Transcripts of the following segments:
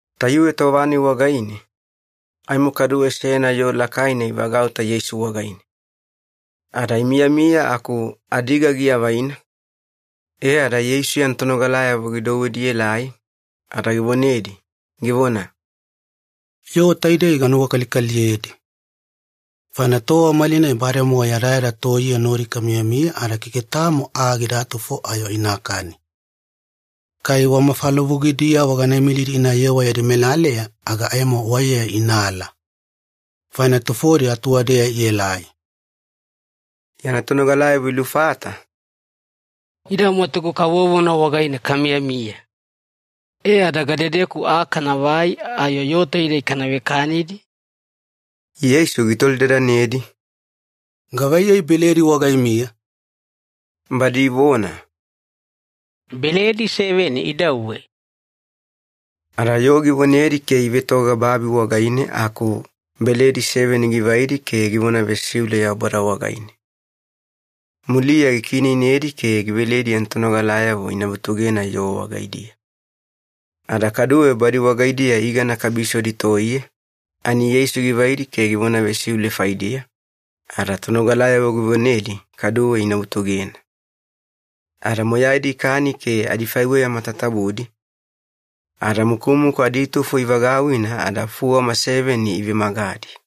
Tayuwe tova-nai wagaine, aimo kaduwe seyana yoo lakaina ivagauta Yeisu wagaine. Ada imiyamiya aku adiga giavaina, e ada Yeisu yana tonogalayavo gidouwedi ielai, ada givonedi, givona, “Yoo taidei ganuwakalikaliyedi, faina tova malinai bademowa yadayada toiye nodi kamiyamiya ada keke tamo aa gidatufo ayo inakani. Kai wa mafalavugidiyavo gana imilidi inayewa yadi melaleya aga aimo waiya inaala. Faina tufodi atuwadeya ielai.” Yana tonogalayavo ilufata, “Ida mwatugu kavovona wagaine kamiyamiya. E ada gadedeku aa kanavai ayo yoo taidei kana vekanidi?” Yeisu gitolidadanedi, “Gavaiyei beledi wagaimiya?” Badi ivona, “Beledi seveni idauwe.” Ada yoo givonedi ke ivetoga babi wagaine aku beledi seveni givaidi ke givona vesiule Yaubada wagaine. Muliya gikiineinedi ke giveledi yana tonogalayavo ina vutugena yoo wagaidiya. Ada kaduwe badi wagaidiya igana kabisodi toiye, ani Yeisu givaidi ke givona vesiule faidiya, ada tonogalayavo givonedi kaduwe ina vutugena. Ada moyaidi ikani ke adifaiweya matatabudi, ada mukumukuna aditufo ivagauwina ada fuwama seveni ivemagadi.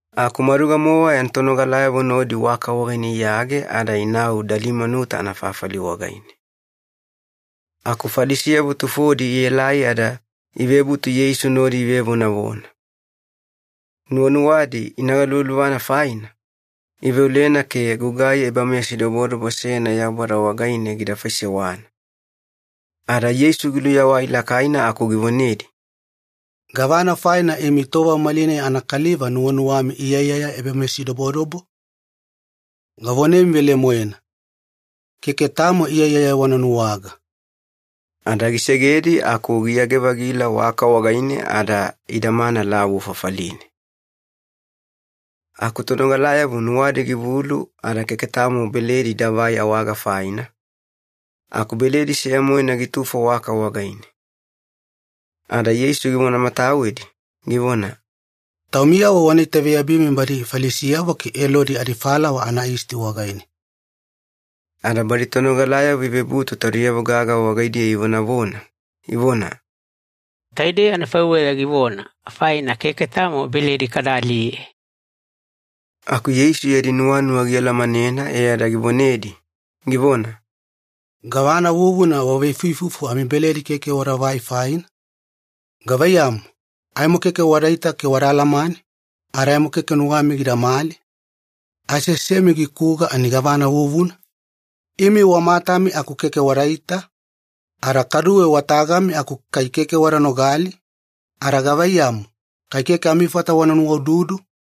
Aku maduga-mowa yana tonogalayavo nodi waka wagaine iyage ada inau Dalimanuta anafafali wagaine. Aku Falisiyavo tufodi ielai ada ivebutu Yeisu nodi ivevonavona. Nuwanuwadi ina galuvaluvana faina, iveolena ke gugai ebameyasidobodobo seyana Yaubada wagaine gida faisewana. Ada Yeisu giluyawai lakaina aku givonedi, “Gavana faina imi tova malinai anakaliva nuwanuwami iyaiyaya ebameyasidobodobo? Gavonemi velemoena, keke tamo iyaiyaya wana nuwaga.” Ada gisegedi aku giyage-vagila waka wagaine ada idamana lavu fafaline. Aku tonogalayavo nuwadi givulu ada keke tamo beledi idavai awaga faina, aku beledi seya-moena gitufo waka wagaine. Ada Yeisu givonamatawedi, givona, “Taumiyavo wana itaveyabimi badi Falisiyavo ke Elodi adifalawa anayisti wagaine.” Ada badi tonogalayavo ivebutu taudiyavo gaga wagaidiya ivonavona, ivona, “Taidei anafaiweya givona, faina keke tamo beledi kada aliye.” Aku Yeisu yadi nuwanuwa gialamanena e ada givonedi, givona, “Gavana vuvuna waveifuifufu amibeledi keke wadavai faina? Gavaiyamu, aimo keke wadaita ke wada alamane, ada aimo keke nuwami gidamali? Aseasemi gikuga ani gavana vuvuna? Imi wa matami aku kai keke wadaita? Ada kaduwe wa tagami aku kai keke wada nogali? Ada gavaiyamu, kai keke amifata wana nuwaududu?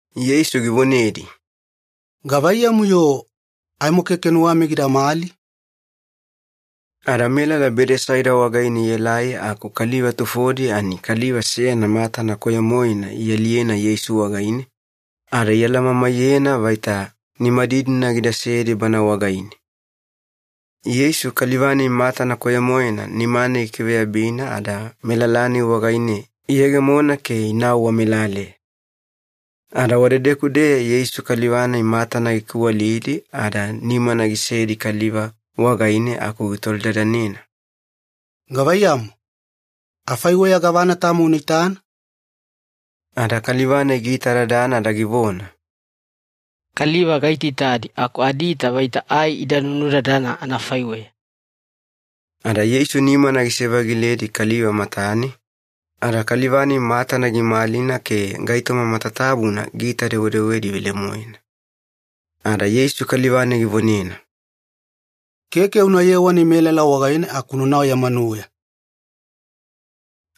Yeisu givonedi, “Gavaiyamu-yo aimo keke nuwami gidamali?” Ada melala Bedesaida wagaine ielai aku kaliva tufodi ani kaliva seyana matana koyo-moena ialiyena Yeisu wagaine, ada ialamamaiyena vaita nimadidina gidasedi bana wagaine. Yeisu kaliva-nai matana koyo-moena nimane gikiveyabina ada melala-nai wagaine iyegemona ke inau wamelaleya. Ada wadedeku-deya Yeisu kaliva-nai matana gikiwalidi ada nimana gisedi kaliva wagaine aku gitolidadanena, “Gavaiyamu, afaiweya gavana tamo una itana?” Ada kaliva-nai giitadadana ada givona, “Kaliva gaitaitadi aku adiita vaita ai ida nunudadana anafaiweya.” Ada Yeisu nimana gisevagiledi kaliva matane, ada kaliva-nai matana gimalina ke gaitoma matatabuna giita-dewedewedi velemoena. Ada Yeisu kaliva-nai givonena, “Keke una yewani melala wagaine aku unanau ya manuweya.”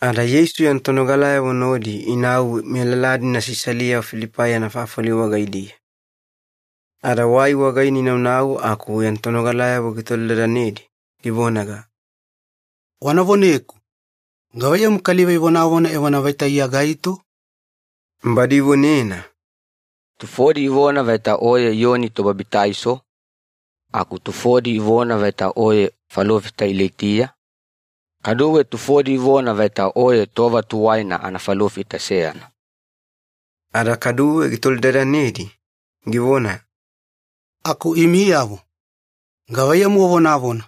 Ada Yeisu yana tonogalayavo nodi inau melala-dina Sisalia-Filipai anafafali wagaidiya. Ada wai wagaine inaunau aku yana tonogalayavo gitolidadanedi, givonaga, “Wana voneku, gavaiyamu kaliva ivonavona evona vaita Iya gaito?” Badi ivonena, “Tufodi ivona vaita Oye Iyoni Tobabitaiso, aku tufodi ivona vaita Oye falofita Ilaitiya, kaduwe tufodi ivona vaita Oye tova tuwaina anafalofita seyana.” Ada kaduwe gitolidadanedi, givona, “Aku imiyavo, gavaiyamu wavonavona,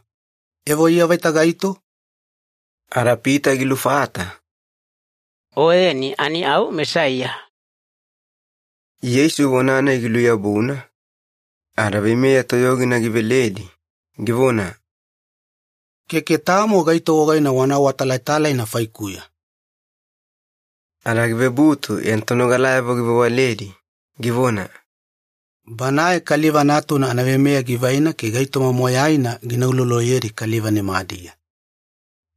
evo Iya vaita gaito?” Ada Pita gilufata, “Oyeni ani au Mesaiya.” Yeisu vona-nai giluyabuna, ada veimeya toyogina giveledi, givona, “Keke tamo gaito wagaine wana awatalatalaina faikuya.” Ada givebutu yana tonogalayavo givewaledi, givona, “Banae Kaliva Natuna anaveimeya givaina ke gaitoma moyaina gina uloloyedi kaliva nimadiya.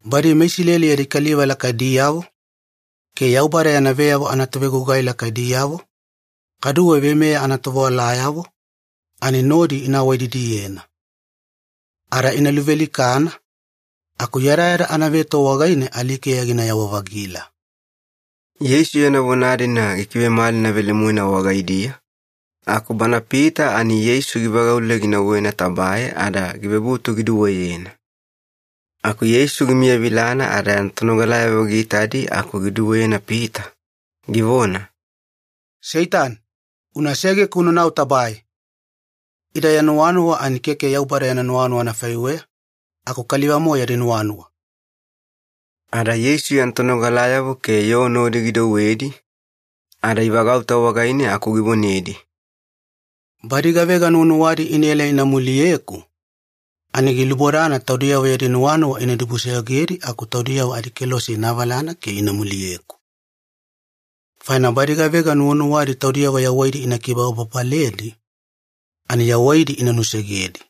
Badi meIsileli yadi kaliva lakaidiyavo, ke Yaubada yana veyavo anatovegugai lakaidiyavo, kaduwe veimeya anatovewalayavo, ani nodi ina awaididiyena. Ada ina luvealikana, aku yadayada anaveto wagaine alikeya ginayawa-vagila.” Yeisu yana vona-dina gikivemalina velemoena wagaidiya, aku bana Pita ani Yeisu givagaule ginauwena tabae ada givebutu giduweyena. Aku Yeisu gimiyavilana ada yana tonogalayavo giitadi aku giduweyena Pita, givona, “Seitani, una segeku unanau tabae! Ida ya nuwanuwa ani keke Yaubada yana nuwanuwa anafaiweya, aku kaliva-mowa yadi nuwanuwa.” Ada Yeisu yana tonogalayavo ke yoo nodi gidouwedi, ada ivagauta wagaine aku givonedi, “Badi gavega nuwanuwadi inaela ina muliyeku, ani gilubodana taudiyavo yadi nuwanuwa ina dibusoyogedi aku taudiyavo adikelose ina avalana ke ina muliyeku. Faina badi gavega nuwanuwadi taudiyavo yawaidi ina kibababaledi, ani yawaidi ina nusegedi.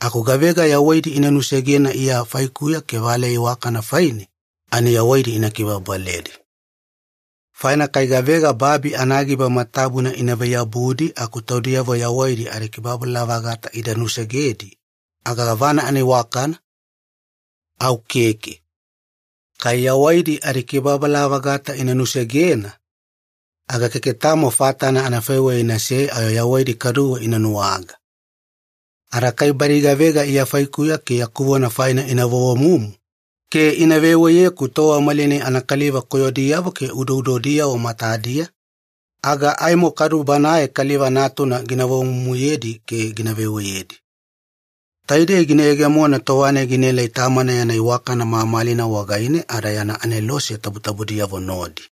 Aku gavega yawaidi ina nusegena Iya faikuya ke valeya iwakana faine, ani yawaidi ina kibababaledi. Faina kai gavega babi anagiba matatabuna inavai-yabudi aku taudiyavo yawaidi adikibababala-vagata ida nusegedi, aga gavana anaiwakana? Au keke. Kai yawaidi adikibababala-vagata ina nusegena, aga keke tamo fatana anafaiweya inasei ayo yawaidi kaduwe ina nuwaga. Ada kai badi gavega Iya faikuya ke yaku vona faina ina vovomumu ke ina veweyeku tova malinai anakaliva koyodiyavo ke udoudodiyavo matadiya, aga aimo kadu Banae Kaliva Natuna gina vovomumuyedi ke gina veweyedi. Taidei gina yegemona tova-nai ginaelai Tamana yana iwakana mamalina wagaine ada yana anelose tabutabudiyavo nodi.”